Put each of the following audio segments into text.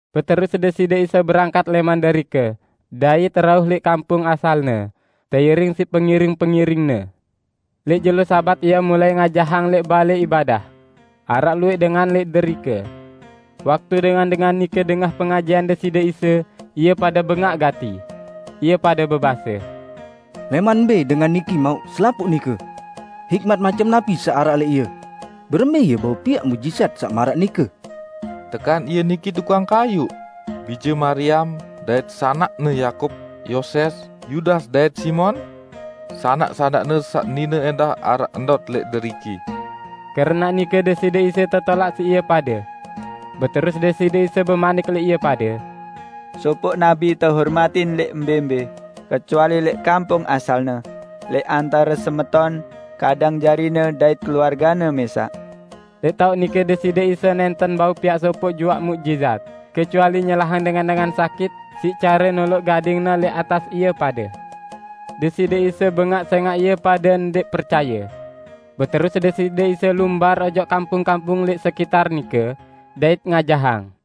Beterus Deside Isa berangkat lẽman derike dait rauh lẽq kampung asal-Ne, teiring siq pengiring-pengiring-Ne. Lẽq jelo Sabat Ie mulai ngajahang lẽq balẽ ibadah. Araq luwẽq dengan lẽq derike. Waktu dengan-dengan nike dengah pengajahan Deside Isa, ie pade bengaq gati. Ie pade bebase, "Lẽman mbẽ dengan niki mauq selapuq nike? Hikmat macem napi saq araq lẽq Ie? Berembẽ Ie bau piaq muqjizat saq maraq nike? Tekan Ie niki tukang kayuq, bije Mariam, dait sanakne Yakub, Yoses, Yudas dait Simon? Sanak-sanak-Ne saq nine ẽndah araq ndot lẽq deriki." Keranaq nike Deside Isa tetolaq siq ie pade. Beterus Deside Isa bemanik lẽq ie pade, "Sopoq nabi tehormatin lẽq mbẽ-mbẽ, kecuali lẽq kampung asalne, lẽq antare semeton, kadang jarine dait keluargene mẽsaq." Lẽq taoq nike Deside Isa nẽnten bau piaq sopoq juaq muqjizat, kecuali nyelahang dengan-dengan sakit siq care noloq gading-Ne lẽq atas ie pade. Deside Isa bengaq sẽngaq ie pade ndẽq percaye. Beterus Deside Isa lumbar ojok kampung-kampung lẽq sekiter nike, dait ngajahang.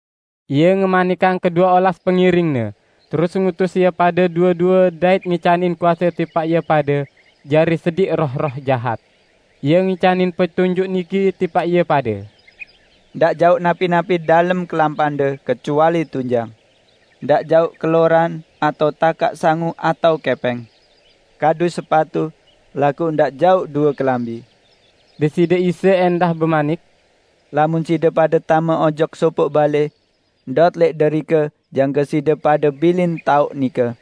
Ie ngemanikang kedue olas pengiring-Ne, terus ngutus ie pade due-due dait ngicanin kuase tipaq ie pade jari sediq roh-roh jahat. Ie ngicanin petunjuk niki tipaq ie pade, "Ndaq jauq napi-napi dalem kelampande, kecuali tunjang. Ndaq jauq keloran, atao takaq sangu atao kẽpẽng. Kadu sepatu, laguq ndaq jauq due kelambi." Deside Isa ẽndah bemanik, "Lamun side pade tame ojok sopoq balẽ, ndot lẽq derike jangke side pade bilin taoq nike.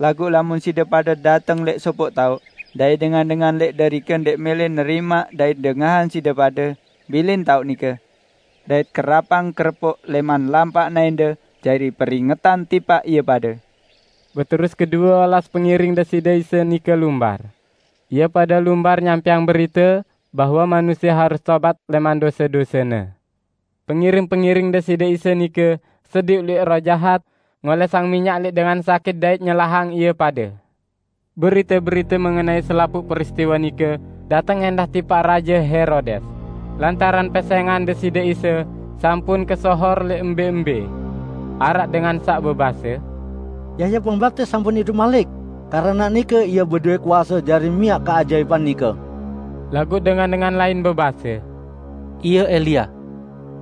Laguq lamun side pade dateng lẽq sopoq taoq, dait dengan-dengan lẽq derike ndẽq mẽlẽ nerimaq dait dengahang side pade, bilin taoq nike. Dait kerapang kerepuk lẽman lampak naẽnde jari peringetan tipaq ie pade!" Beterus kedue olas pengiring Deside Isa nike lumbar. Ie pade lumbar nyampẽang berite bahwe manusie harus tobat lẽman dose-dosene. Pengiring-pengiring Deside Isa nike sediq luwẽq roh jahat, ngolẽsang minyak lẽq dengan sakit dait nyelahang ie pade. Berite-berite mengenai selapuq peristiwe nike dateng ẽndah tipaq Raje Herodes, lantaran pesẽngan Deside Isa sampun kesohor lẽq mbẽ-mbẽ. Araq dengan saq bebase, "Yahya Pembaptis sampun idup malik! Keranaq nike Ie bedowẽ kuase jari miaq keajaipan nike." Laguq dengan-dengan lain bebase, "Ie Elia."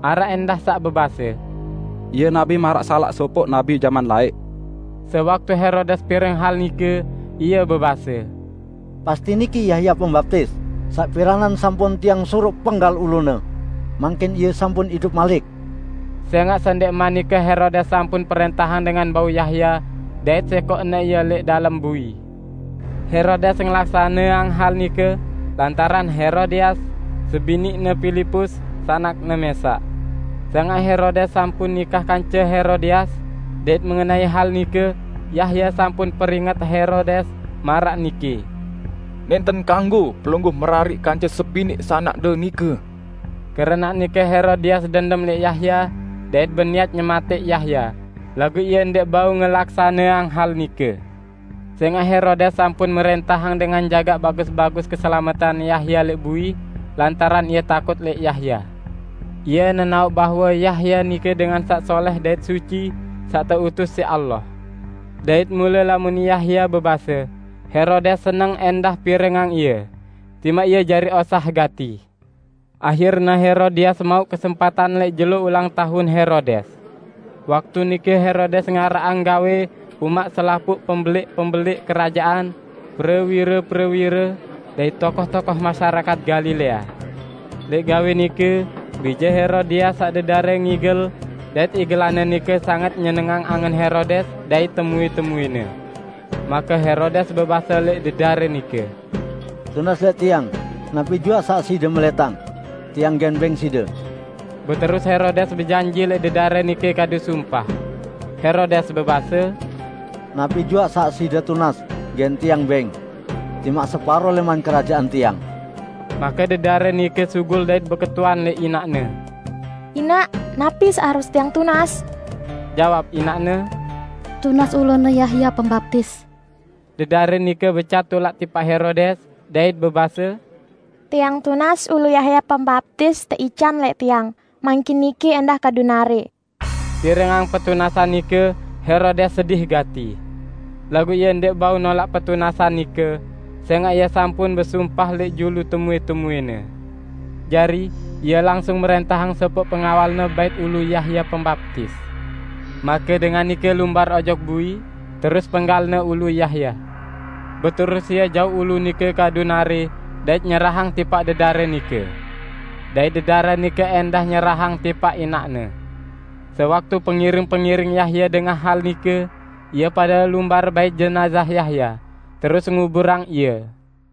Araq ẽndah saq bebase, "Ie nabi maraq salaq sopoq nabi jaman laẽq." Sewaktu Herodes pireng hal nike, ie bebase, "Pasti niki Yahya Pembaptis saq piranan sampun tiang suruq penggal ulune. Mangkin ie sampun idup malik!" Sẽngaq sendẽqman nike Herodes sampun prẽntahang dengan bau Yahya, dait sẽkoqne ie lẽq dalem bui. Herodes ngelaksaneang hal nike lantaran Herodias, sebiniqne Pilipus sanakne mẽsaq. Sẽngaq Herodes sampun nikah kance Herodias, dait mengenai hal nike Yahya sampun peringet Herodes maraq niki, "Nẽnten kanggo pelungguh merariq kance sebiniq sanakde nike!" Keranaq nike Herodias dendem lẽq Yahya dait beniat nyematẽq Yahya, laguq ie ndẽq bau ngelaksaneang hal nike. Sẽngaq Herodes sampun mrẽntahang dengan jagaq bagus-bagus keselametan Yahya lẽq bui, lantaran ie takut lẽq Yahya. Ie nenaoq bahwe Yahya nike dengan saq solẽh dait suci saq teutus siq Allah. Dait mule lamun Yahya bebase, Herodes seneng ẽndah pirengang ie, timaq ie jari osah gati. Ahirne Herodias mauq kesempatan lẽq jelo ulang taun Herodes. Waktu nike Herodes ngaraqang gawẽ umaq selapuq pembelẽq-pembelẽq kerajaan, prewire-prewire, dait tokoh-tokoh masyarakat Galilea. Lẽq gawẽ nike, bije Herodias saq dedare ngigel, dait igelanne nike sanget nyenengang angen Herodes dait temuẽ-temuẽne. Make Herodes bebase lẽq dedare nike, "Tunas lẽq tiang napi juaq saq side melẽtang. Tiang gen bẽng side!" Beterus Herodes bejanji lẽq dedare nike kadu sumpah. Herodes bebase, "Napi juaq saq side tunas gen tiang bẽng, timaq separo lẽman kerajaan tiang." Make dedare nike sugul dait beketuan lẽq inaqne, "Inaq, napi saq harus tiang tunas?" Jawab inaqne, "Tunas ulune Yahya Pembaptis." Dedare nike becat tulak tipaq Herodes, dait bebase, "Tiang tunas ulu Yahya Pembaptis teican lẽq tiang mangkin niki ẽndah kadu narẽ!" Pirengang petunasan nike Herodes sedih gati. Laguq ie ndẽq bau nolaq petunasan nike sẽngaq ie sampun besumpah lẽq julu temuẽ-temuẽne. Jari, ie langsung mrẽntahang sopoq pengawalne bait ulu Yahya Pembaptis. Make dengan nike lumbar ojok bui, terus penggalne ulu Yahya. Beterus ie jauq ulu nike kadu narẽ dait nyerahang tipaq dedare nike. Dait dedare nike ẽndah nyerahang tipaq inaqne. Sewaktu pengiring-pengiring Yahya dengah hal nike, ie pade lumbar bait jenazah Yahya, terus nguburang ie.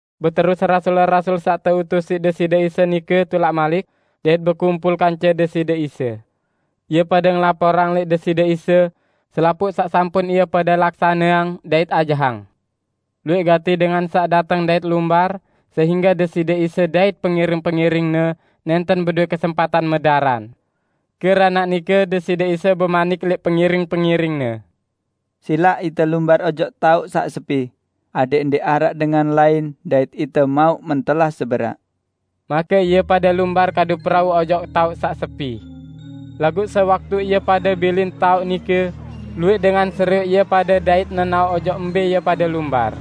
Beterus rasul-rasul saq teutus siq Deside Isa nike tulak malik, dait bekumpul kance Deside Isa. Ie pade ngelaporang lẽq Deside Isa selapuq saq sampun ie pade laksaneang dait ajahang. Luwẽq gati dengan saq dateng dait lumbar sehingge Deside Isa dait pengiring-pengiring-Ne nẽnten bedowẽ kesempatan medaran. Keranaq nike Deside Isa bemanik lẽq pengiring-pengiring-Ne, "Silaq ite lumbar ojok taoq saq sepi adẽq ndẽq araq dengan lain dait ite mauq mentelah seberaq." Make ie pade lumbar kadu perau ojok taoq saq sepi. Laguq sewaktu ie pade bilin taoq nike, luwẽq dengan serioq ie pade dait nenaoq ojok mbẽ ie pade lumbar.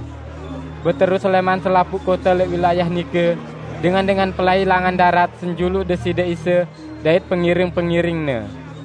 Beterus lẽman selapuq kote lẽq wilayah nike, dengan-dengan pelai langan darat senjuluq Deside Isa dait pengiring-pengiring-Ne.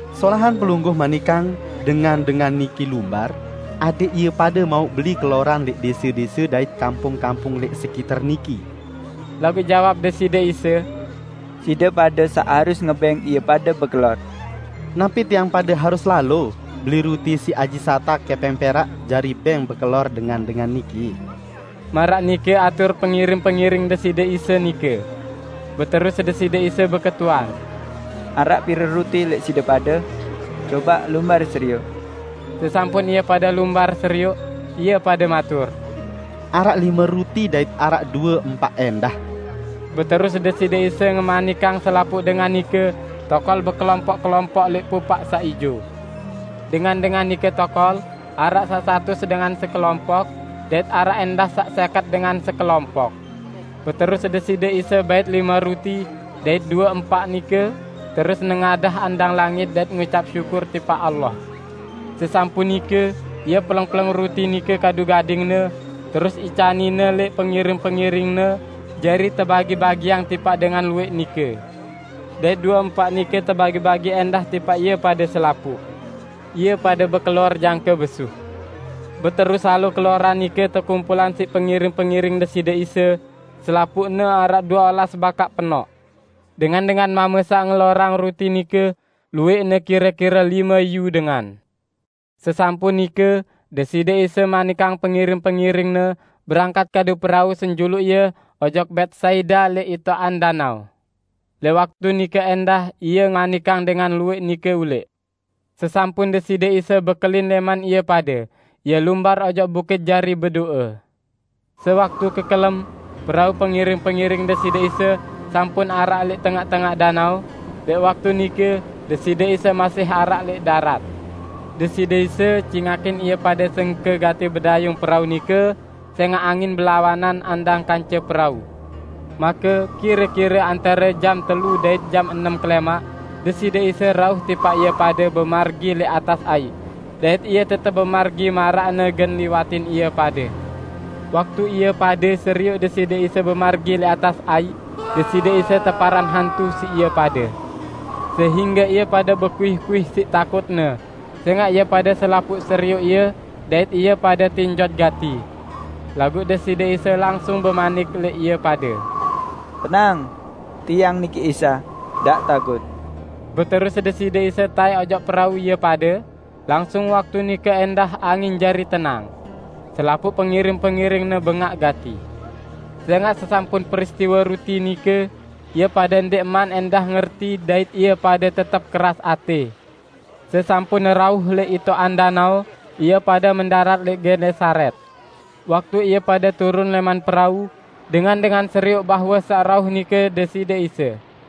Solahan Pelungguh manikang dengan-dengan niki lumbar, adẽq ie pade mauq beli keloran lẽq dẽse-dẽse dait kampung-kampung lẽq sekiter niki." Laguq jawab Deside Isa, "Side pade saq harus ngebẽng ie pade bekelor." "Napi tiang pade harus lalo beli ruti siq aji satak kẽpẽng perak jari bẽng bekelor dengan-dengan niki?" Maraq nike atur pengiring-pengiring Deside Isa nike. Beterus Deside Isa beketuan, "Araq pire ruti lẽq side pade? Cobaq lumbar serioq." Sesampun ie pade lumbar serioq, ie pade matur, "Araq lime ruti dait araq due empaq ẽndah." Beterus Deside Isa ngemanikang selapuq dengan nike tokol bekelompoq-kelompoq lẽq pupaq saq ijo. Dengan-dengan nike tokol, araq saq satus dengan sekelompoq, dait araq ẽndah saq sẽket dengan sekelompoq. Beterus Deside Isa bait lime ruti dait due empaq nike, terus nengadah andang langit dait ngucap syukur tipaq Allah. Sesampun nike, Ie peleng-peleng ruti nike kadu gading-Ne terus icanin-Ne lẽq pengiring-pengiring-Ne jari tebagi-bagiang tipaq dengan luwẽq nike. Dait due empaq nike tebagi-bagi ẽndah tipaq ie pade selapuq. Ie pade bekelor jangke besuh. Beterus salo keloran nike tekumpulang siq pengiring-pengiring Deside Isa -- selapuqne araq due olas bakaq penoq. Dengan-dengan mame saq ngelorang ruti nike luwẽqne kire-kire lime iyu dengan. Sesampun nike, Deside Isa manikang pengiring-pengiring-Ne berangkat kadu perau senjuluq Ie ojok Betsaida lẽq itoqan danao. Lẽq waktu nike ẽndah Ie ngemanikang dengan luwẽq nike ulẽq. Sesampun Deside Isa bekelin lẽman ie pade, Ie lumbar ojok bukit jari bedo'e. Sewaktu kekelem, perau pengiring-pengiring Deside Isa sampun araq lẽq tengaq-tengaq danao, lẽq waktu nike Deside Isa masih araq lẽq darat. Deside Isa cingakin ie pade sengke gati bedayung perau nike sẽngaq angin belawanan andang kance perau. Make kire-kire antare jam telu dait jam enem kelẽmaq, Deside Isa rauh tipaq ie pade bemargi lẽq atas aiq, dait Ie tetep bemargi maraqne gen liwatin ie pade. Waktu ie pade serioq Deside Isa bemargi lẽq atas aiq, Deside Isa teparan hantu siq ie pade, sehingge ie pade bekuih-kuih siq takutne, sẽngaq ie pade selapuq serioq Ie dait ie pade tinjot gati. Laguq Deside Isa langsung bemanik lẽq ie pade, "Tenang! Tiang niki Isa, ndaq takut!" Beterus Deside Isa taẽk ojok perau ie pade, langsung waktu nike ẽndah angin jari tenang. Selapuq pengiring-pengiring-Ne bengaq gati. Sẽngaq sesampun peristiwe ruti nike ie pade ndẽqman ẽndah ngerti dait ie pade tetep keras atẽ. Sesampun rauh lẽq itoqan danao, ie pade mendarat lẽq Genesaret. Waktu ie pade turun lẽman perau, dengan-dengan serioq bahwe saq rauh nike Deside Isa.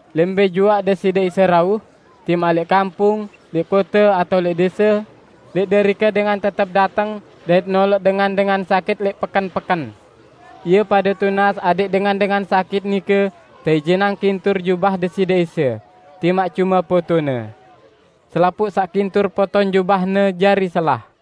Lẽq mbẽ juaq Deside Isa rauh -- timaq lẽq kampung, lẽq kote atao lẽq dẽse -- lẽq derike dengan tetep dateng dait noloq dengan-dengan sakit lẽq peken-peken. Ie pade tunas adẽq dengan-dengan sakit nike teijinang kintur jubah Deside Isa, timaq cume potone. Selapuq saq kintur poton jubah-Ne jari selah.